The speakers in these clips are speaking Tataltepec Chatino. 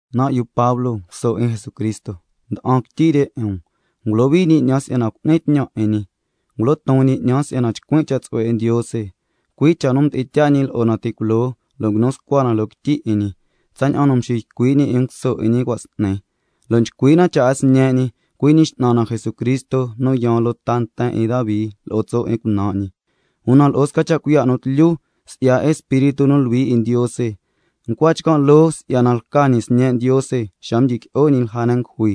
Nan' yu Pablo nu lca nguso 'in Jesucristo nda'an quityi re 'in um, ngulohui ñi 'ñan si'yana cu'nin tñan 'in ñi, ngulo ton ñi 'ñan si'yana chcuin' cha' tsu'hue 'in Ndiose, cui' cha' nu mdi'in tyaa ñi lo'o na ti' culoo lo' nguinu scua na loo quityi 'in ñi, tsaña'an nu mxiycui' ñi 'in nguso 'in ñi cua' s'ni. Lo' nchcui' na cha' 'in Sñe' ñi, cui' ñi X'nan na Jesucristo nu yaan loo ta nten 'in Davi lo'o tso' 'in cunan' ñi, una lo'o sca cha' cuiya' nu tlyu, si'ya Espíritu nu Luhui 'in Ndiose, ncua chcan' loo si'yana lca ñi Sñe' Ndiose xa mdyiqui'o ñi lja ne' ngujui.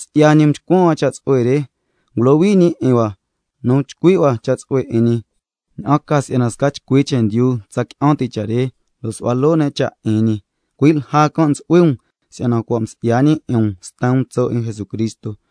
Si'ya ñi can' cha' mchcuan hua cha' tsu'hue re, ngulohui ñi 'in hua nu chcui' hua cha' tsu'hue 'in ñi, ña'an ca si'yana sca chcui chendyu tsa qui'an ti' cha' re, lo' caja nu cu'ni tnu 'in ñi, cui' lja can' ntsu'hui um, si'yana cua' msi'ya ñi 'in um sten um tso' 'in Jesucristo,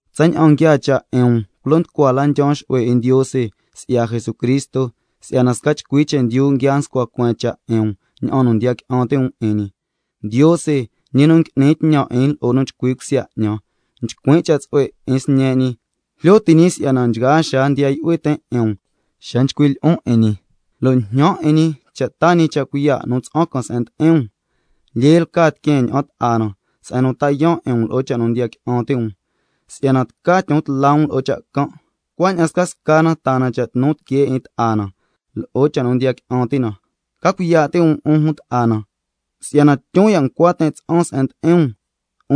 Tsaña'an nguiaa cha' 'in um, culo nducua la ndyaan xu'hue 'in Ndiose si'ya Jesucristo si'yana sca chcui chendyu nguia nscua cueen cha' 'in um ña'an nu ndiya qui'an ti' um 'in ñi. Ndiose, ñi nu ngui'nin tñan 'in lo'o nu chcui cusya 'ñan, nchcuin' cha' tsu'hue 'in Sñe' ñi, jlyo ti' ñi si'yana nchgaa xaa ndiya yu'hui tin' 'in um xa nchcuin' lyi'on 'in ñi, lo' njñan 'in ñi cha' taa ñi cha' cuiya' nu tsa'an can se'en ndi'in um, si'yana lyee lca tiqueen ña'an ta'a na se'en nu ta yaan' 'in um lo'o cha' nu ndiya qui'an ti' um, si'yana tca tyon tla um lo'o cha' can', cuaña'an scasca na taa na cha' tnu tiquee 'in ta'a na lo'o cha' nu ndiya qui'an ti' na. Ca cuiya' ti' um, 'un jun ta'a na, si'yana tyun ya' ncua tin' tsa'an se'en ndi'in um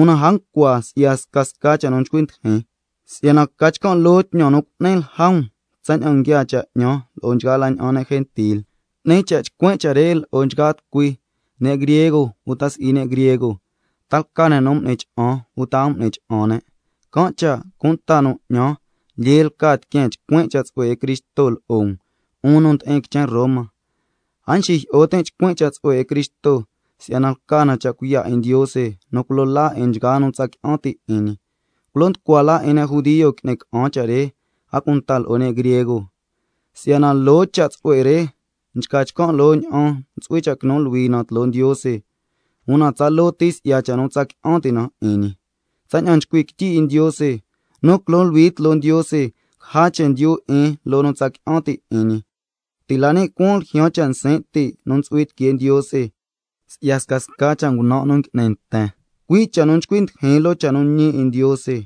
(una a ncua si'ya scasca cha' nu nchcui ndijin), si'yana ca chcan' loo tñan nu ngui'nin lja um, cui' ña'an nguiaa cha' 'ñan lo'o nchgaa la ña'an ne' gentil. Can' cha' 'ni cha' chcuin' cha' re lo'o nchgaa tucui, ne' griego uta si'i ne' griego, ta lca ne' nu m'ni cha'an uta a m'ni cha'an ne'. Can' cha' cunta cha' nu 'ñan lyee lca tiqueen chcuin' cha' tsu'hue 'in Cristo lo'o um, 'un nu ndi'in quichen Roma. A nxijyi'o tin' chcuin' cha' tsu'hue 'in Cristo, si'yana lca na cha' cuiya' 'in Ndiose nu culo laa 'in nchgaa nu tsa qui'an ti' 'in ñi, culo nducua la 'in ne' judio ngui'ni ca'an cha' re, a cunta lo'o ne' griego. Si'yana loo cha' tsu'hue re nchca chcan' loo ña'an ntsu'hui cha' quinu luhui na tloo Ndiose, una tsaloo ti si'ya cha' nu tsa qui'an ti' na 'in ñi, tsaña'an nchcui' quityi 'in Ndiose: —Nu quinu luhui tloo Ndiose, caja chendyu 'in loo nu tsa qui'an ti' 'in ñi—. Si'yana ti' la ni' cuaan ljyaan cha' nsin' ti' nu ntsu'hui tiquee Ndiose si'ya scasca cha' ngunan' nu ngui'ni nten, cui' cha' nu nchcui ndijin loo cha' nu ñi 'in Ndiose.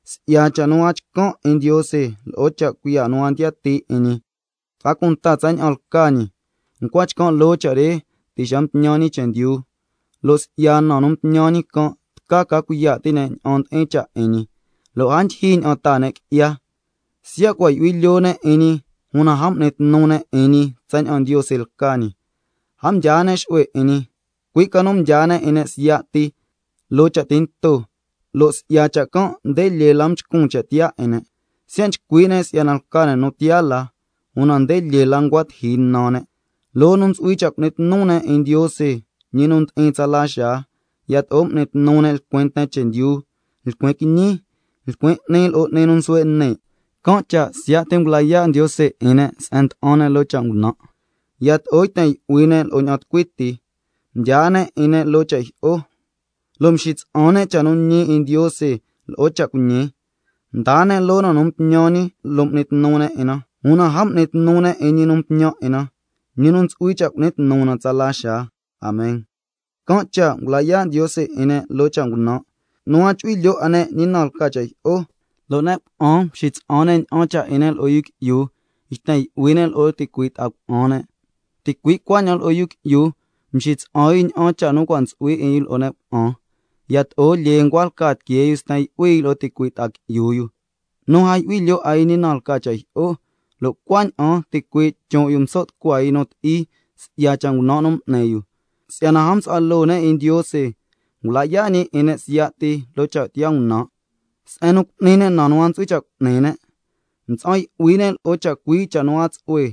Si'yana cha' nu a chcan' 'in Ndiose, lo'o cha' cuiya' nu a ndiyatii 'in ñi, a cunta tsaña'an lca ñi, ncua chcan' loo cha' re ti' xa mtñan ñi chendyu, lo' si'ya na nu mtñan ñi can' tca ca cuiya' ti' ne' ña'an ndi'in cha' 'in ñi, lo' a ndyijyi ña'an taa ne' qui'ya. Siya' cua' yu'hui lyoo ne' 'in ñi, una a m'ni tnu ne' 'in ñi tsaña'an Ndiose lca ñi, a mdyaa ne' xu'hue 'in ñi, cui' ca nu mdyaa ne' 'in ne' siya' ti loo cha' tinto, lo' si'ya cha' can' nde lyee la mchcun cha' tiyaa 'in ne'. Siya' nchcui' ne' si'yana lca ne' sca nu tiyaa la, una nde lyee la ncua tiji nan ne', loo nu ntsu'hui cha' cu'ni tnu ne' 'in Ndiose, ñi nu ndi'in tsala xaa, yato'o m'ni tnu ne' lcuin nten chendyu, lcuin quiñi, lcuin 'ni lo'o 'ni nu nsuhue' ni'. Can' cha' siya' ti ngula yaa' Ndiose 'in ne' se'en nda'an ne' loo cha' ngunan' can', yato'o yten yu'hui ne' lo'o ña'an tucui ti, mdyaa ne' 'in ne' loo cha' jyi'o, cui' si'yana mxitsa'an ne' cha' nu ñi 'in Ndiose lo'o cha' cuiñi can', mdaa ne' loo na nu mtñan ñi lo' m'ni tnu ne' 'in na, una a m'ni tnu ne' 'in Ñi nu Mtñan 'in na, ñi nu ntsu'hui cha' cu'ni tnu na 'in tsala xaa. Amen. Can' cha' ngula yaa' Ndiose 'in ne' loo cha' ngunan' can', nu a chu'hui lyoo 'a ne' ñi na lca cha' jyi'o, lo' ne' cuna'an mxitsa'an ne' ña'an cha' 'in ne' lo'o yu qui'yu lo' yten yu'hui ne' lo'o ticui' ta'a cuna'an ne', ticui' cuaña'an yu qui'yu, mxitsa'an yu ña'an cha' nu cua' ntsu'hui 'in yu lo'o ne' cuna'an, yato'o lyee la ncua lca tiquee yu sten yu'hui yu lo'o ticui' ta'a qui'yu yu, nu a yu'hui lyoo 'a yu ñi na lca cha' jyi'o, lo' cuaña'an ticuii' chon' yu mso' tucua yu nu ti'i si'ya cha' ngunan' nu m'ni yu. Si'yana a msu'hua loo ne' 'in Ndiose, can' cha' ngula yaa' ñi 'in ne' siya' ti loo cha' tiyaa ngunan' can', se'en nu cu'ni ne' na nu a ntsu'hui cha' cu'ni ne', mtsa'an yu'hui ne' lo'o chacui' cha' nu a tsu'hue,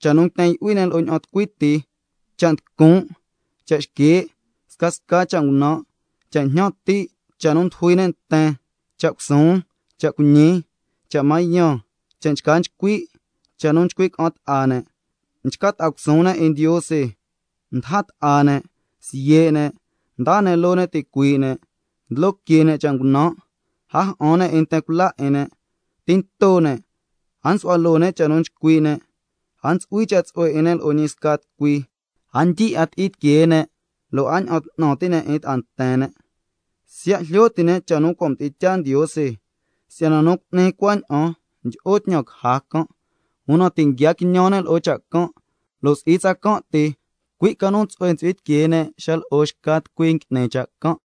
cha' nu nguiten yu'hui ne' lo'o ña'an tucui ti, cha' nducun', cha' xquee', scasca cha' ngunan', cha' jñan ti', cha' nu ndujui ne' nten, cha' cusuun, cha' cuiñi, cha' mañan, cha' nchca nchcui', cha' nu nchcui' ca'an ta'a ne', nchca ta'a cusuun ne' 'in Ndiose, ndaja ta'a ne', siye' ne', ndaa ne' loo ne' ticuii' ne', ndlo que ne' cha' ngunan', a ja'an ne' 'in nten cula 'in ne', tinto ne', a nsu'hua loo ne' cha' nu nchcui' ne', a ntsu'hui cha' tsu'hue 'in ne' lo'o ñi sca tucui, a ndyi 'a ti'i tiquee ne', lo' a ña'an 'tnan ti' ne' 'in ta'a nten ne'. Siya' jlyo ti' ne' cha' nu cua' mdi'in tyaa Ndiose si'yana nu cu'ni cuaña'an ndyi'o tñan caja can', una ti' nguia quiñan ne' lo'o cha' can', lo' si'i tsacan' ti, cui' ca nu tsu'hue ntsu'hui tiquee ne' xa nu lo'o xca tucui ngui'ni cha' can'.